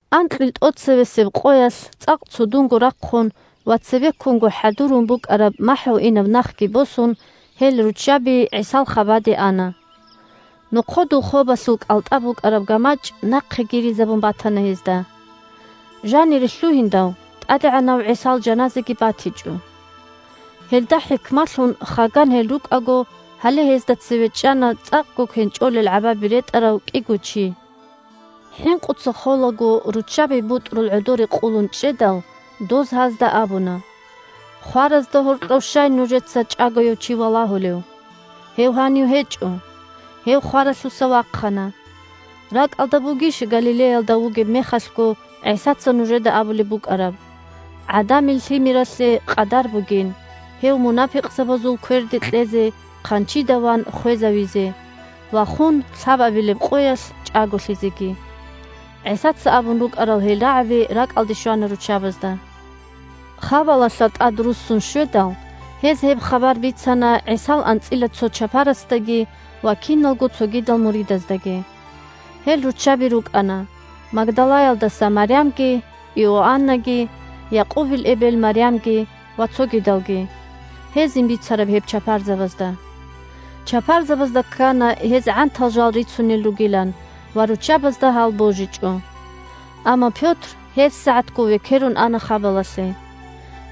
Анкьил тӀоцебесеб къоялъ, цӀакъ цудунго рахъун ва цебеккунго хӀадурун букӀараб махӀгьуинаб нахги босун, гьел руччаби ГӀисал хабаде ана. Нохъодул хобалъул кӀалтӀа букӀараб гамачӀ нахъе гиризабун батана гьезда. Жанире лъугьиндал, ТӀадегӀанав ГӀисал жаназаги батичӀо. Гьелда хӀикмалъун, хаган гьел рукӀаго, гьале гьезда цеве чӀана цӀакъго кенчӀолел гӀабаби ретӀарав кӀиго чи. ХӀинкъуца холаго, руччаби бутӀрул гӀодоре къулун чӀедал, доз гьазда абуна: – Хваразда гьоркьов щай нужеца чӀагояв чи валагьулев? Гьев гьанив гьечӀо. Гьев хваралъуса вахъана. РакӀалда бугищ Галилеялда вугеб мехалъго ГӀисаца нужеда абулеб букӀараб: ГӀадамил Лъимералъе къадар бугин гьев мунапикъзабазул кверде кьезе, хъанчида ван хвезавизе ва хун лъабабилеб къоялъ чӀаголъизеги. ГӀисаца абун рукӀарал гьел рагӀаби ракӀалде щвана руччабазда. Хабалалъа тӀадруссун щведал, гьез гьеб хабар бицана ГӀисал анцӀила цо чапарасдаги ва киналго цогидал муридаздаги. Гьел руччаби рукӀана: Магдалаялдаса Марямги, Иоаннаги, Якъубил эбел Марямги ва цогидалги – гьезин бицараб гьеб чапарзабазда. Чапарзабазда ккана гьез гӀантал жал рицунел ругилан, ва руччабазда гьал божичӀо. Амма Пётр гьебсагӀатго векерун ана хабалалъе.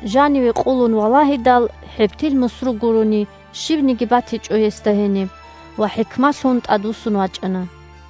Жаниве къулун валагьидал, хӀебтил мусру гурони, щибниги батичӀо гьесда гьениб ва хӀикмалъун тӀадвуссун вачӀана.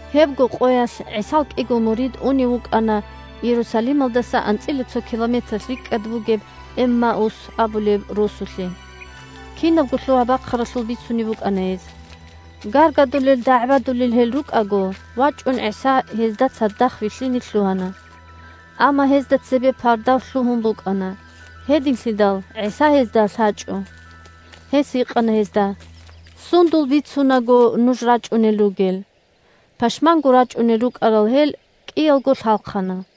Гьебго къоялъ ГӀисал кӀиго мурид унев вукӀана Иерусалималдаса анцӀила цо километралъ рикӀкӀад бугеб Эммаус абулеб росулъе. Кинабго лъугьа-бахъаралъул бицунеб букӀана гьез. Гаргадулел, дагӀбадулел гьел рукӀаго, вачӀун ГӀиса гьезда цадахъ вилълъине лъугьана. Амма гьезда цебе пардав лъугьун букӀана, гьединлъидал ГӀиса гьезда лъачӀо. Гьес гьикъана гьезда: – Сундул бицунаго нуж рачӀунел ругел? Пашманго рачӀунел рукӀарал гьел кӀиялго лъалхъана.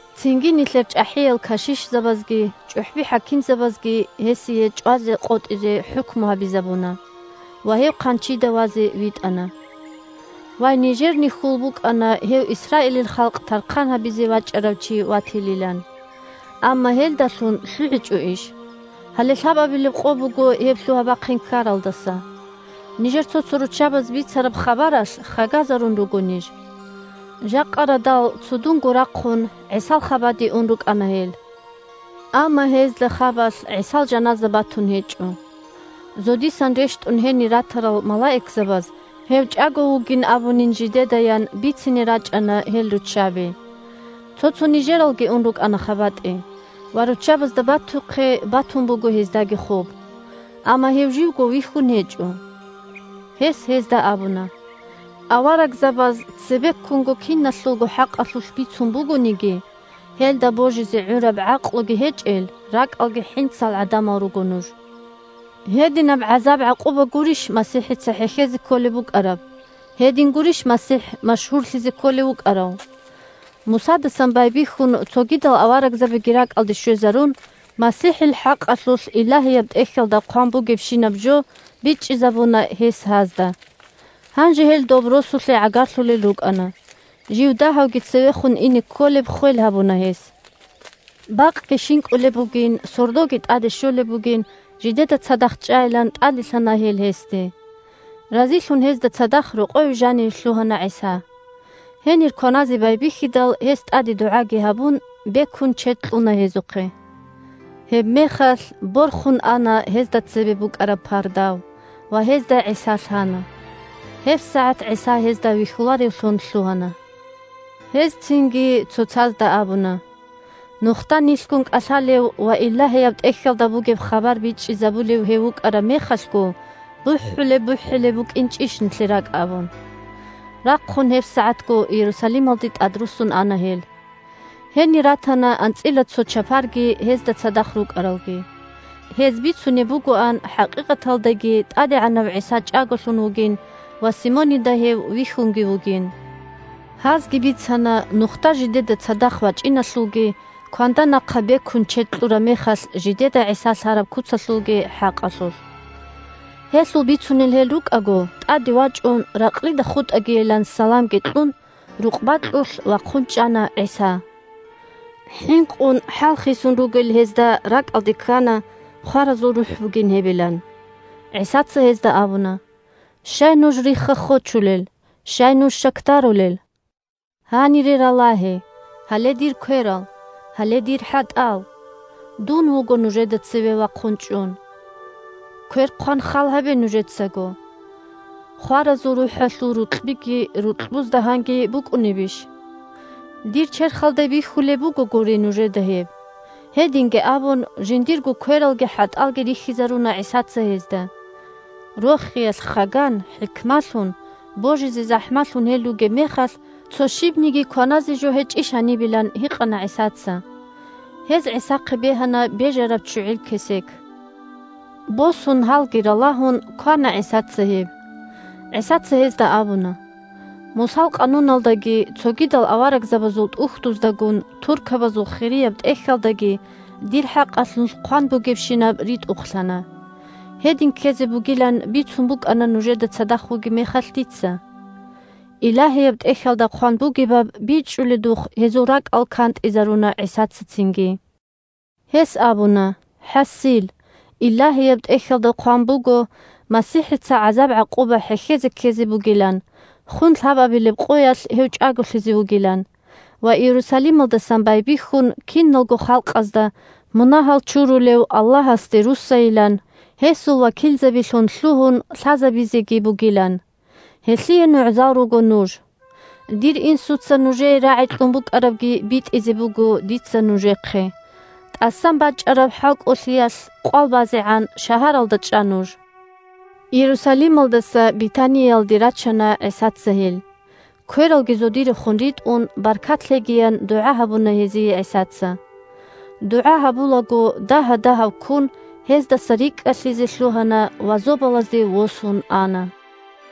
Цинги нилъер чӀахӀиял кашишзабазги чӀухӀби-хӀакимзабазги гьесие чӀвазе къотӀизе хӀукму гьабизабуна, ва гьев хъанчида вазе витӀана. Вай, нижерни хьул букӀана гьев Исраилил халкъ тархъан гьабизе вачӀарав чи ватилилан. Амма гьелдалъун лъугӀичӀо иш: гьале лъабабилеб къо буго гьеб лъугьа-бахъин ккаралдаса. Нижер цо-цо руччабаз бицараб хабаралъ хагазарун руго ниж. Жакъа радал цудунго рахъун ГӀисал хабаде ун рукӀана гьел. Амма гьезда хабалъ ГӀисал жаназа батун гьечӀо. Зодисан рещтӀун гьенир ратарал малаикзабаз гьев чӀаго вугин абунин жидедаян бицине рачӀана гьел руччаби. Цо-цо нижералги ун рукӀана хабатӀе, ва руччабазда батухъе батун буго гьездаги хоб. Амма гьев живго вихьун гьечӀо. Гьес гьезда абуна: – Аварагзабаз цебеккунго киналъулго хӀакъалъулъ бицун бугониги, гьелда божизе гӀураб гӀакълуги гьечӀел ракӀалги хӀинцал гӀадамал руго нуж! Гьединаб гӀазаб-гӀакъуба гурищ МасихӀица хӀехьезе кколеб букӀараб, гьедин гурищ МасихӀ машгьурлъизе кколев вукӀарав? Мусадасан байбихьун цогидал аварагзабиги ракӀалде щвезарун, МасихӀил хӀакъалъулъ Илагьияб ТӀехьалда хъван бугебщинаб жо бичӀчӀизабуна гьес гьазда. Гьанже гьел доб росулъе гӀагарлъулел рукӀана. Жив дагьавги цевехун ине кколеб ххвел гьабуна гьес. Бакъги щинкӀулеб бугин, сордоги тӀаде щолеб бугин, жидеда цадахъ чӀайилан тӀаделъана гьел гьесде. Разилъун гьезда цадахъ рокъове жаниве лъугьана ГӀиса. Гьенир кваназе байбихьидал, гьес, тӀаде дугӀаги гьабун, бекун чед кьуна гьезухъе. Гьебмехалъ борхун ана гьезда цебе букӀараб пардав, ва гьезда ГӀиса лъана. ГьебсагӀат ГӀиса гьезда вихьуларевлъун лъугьана. Гьез цинги цоцазда абуна: – Нухда нилъгун кӀалъалев ва Илагьияб ТӀехьалда бугеб хабар бичӀчӀизабулев гьев вукӀараб мехалъго бухӀулеб-бухӀулеб букӀинчӀищ нилъер ракӀ? – абун. Рахъун гьебсагӀатго Иерусалималде тӀадруссун ана гьел. Гьенир ратана анцӀила цо чапарги гьезда цадахъ рукӀаралги. Гьез бицунеб бугоан хӀакъикъаталдаги ТӀадегӀанав ГӀиса чӀаголъун вугин ва Симонида гьев вихьунги вугин. Гьазги бицана нухда жидеда цадахъ вачӀиналъулги, кванда нахъа бекун чед кьураб мехалъ, жидеда ГӀиса лъараб куцалъулги хӀакъалъулъ. Гьелъул бицунел гьел рукӀаго, тӀаде вачӀун, ракълида хутӀагийилан саламги кьун, рукъ бакьулъ вахъун чӀана ГӀиса. ХӀинкъун, хӀал хисун ругел гьезда ракӀалде ккана хваразул рухӀ бугин гьебилан. ГӀисаца гьезда абуна: – Щай нуж рихха-хочулел? Щай нуж щакдарулел? Гьанире ралагье: гьале дир кверал, гьале дир хӀатӀал. Дун вуго нужеда цеве вахъун чӀун. Квер хъван хал гьабе нужецаго. Хваразул рухӀалъул рукьбиги рукьбузда гьанги букӀунебищ? Дир черхалда бихьулеб бугогури нужеда гьеб. Гьединги абун, жиндирго квералги хӀатӀалги рихьизаруна ГӀисаца гьезда. Рохиялъ хаган, хӀикмалъун, божизе захӀмалъун гьел ругеб мехалъ, цо щибниги кваназе жо гьечӀищ гьанибилан гьикъана ГӀисаца. Гьез ГӀисахъе бегьана бежараб ччугӀил кесек. Босун, гьалги ралагьун, квана ГӀисаца гьеб. ГӀисаца гьезда абуна: – Мусал къануналдаги цогидал аварагзабазул тӀухьдуздагун Туркабазул Хирияб ТӀехьалдаги дир хӀакъалъулъ хъван бугебщинаб ритӀухълъана. Гьедин ккезе бугилан бицун букӀана нужеда цадахъ вугеб мехалъ дица. Илагьияб ТӀехьалда хъван бугебаб бичӀчӀуледухъ, гьезул ракӀал кантӀизаруна ГӀисаца цинги. Гьес абуна: – ХӀасил, Илагьияб ТӀехьалда хъван буго – МасихӀица гӀазаб-гӀакъуба хӀехьезе ккезе бугилан, хун лъабабилеб къоялъ гьев чӀаголъизе вугилан ва Иерусалималдасан байбихьун киналго халкъазда, мунагьал чурулев Аллагьасде руссайилан, гьесул вакилзабилъун лъугьун, лъазабизеги бугилан. Гьелъие нугӀзал руго нуж. Дир Инсуца нужее рагӀи кьун букӀарабги битӀизе буго дица нужехъе. ТӀасан бачӀараб хӀалкӀолъиялъ къвалбазегӀан шагьаралда чӀа нуж. Иерусалималдаса Бетаниялде рачана ГӀисаца гьел. Квералги зодирехун ритӀун, баркат лъегиян дугӀа гьабуна гьезие ГӀисаца. ДугӀа гьабулаго дагьа-дагьавккун гьездаса рикӀкӀалъизе лъугьана ва зобалазде восун ана.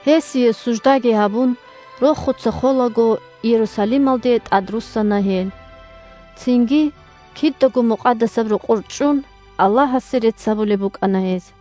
Гьесие суждаги гьабун, рохуца холаго Иерусалималде тӀадруссана гьел. Цинги, кидаго Мукъадасаб Рокъор чӀун, Аллагьасе рецц гьабулеб букӀана гьез.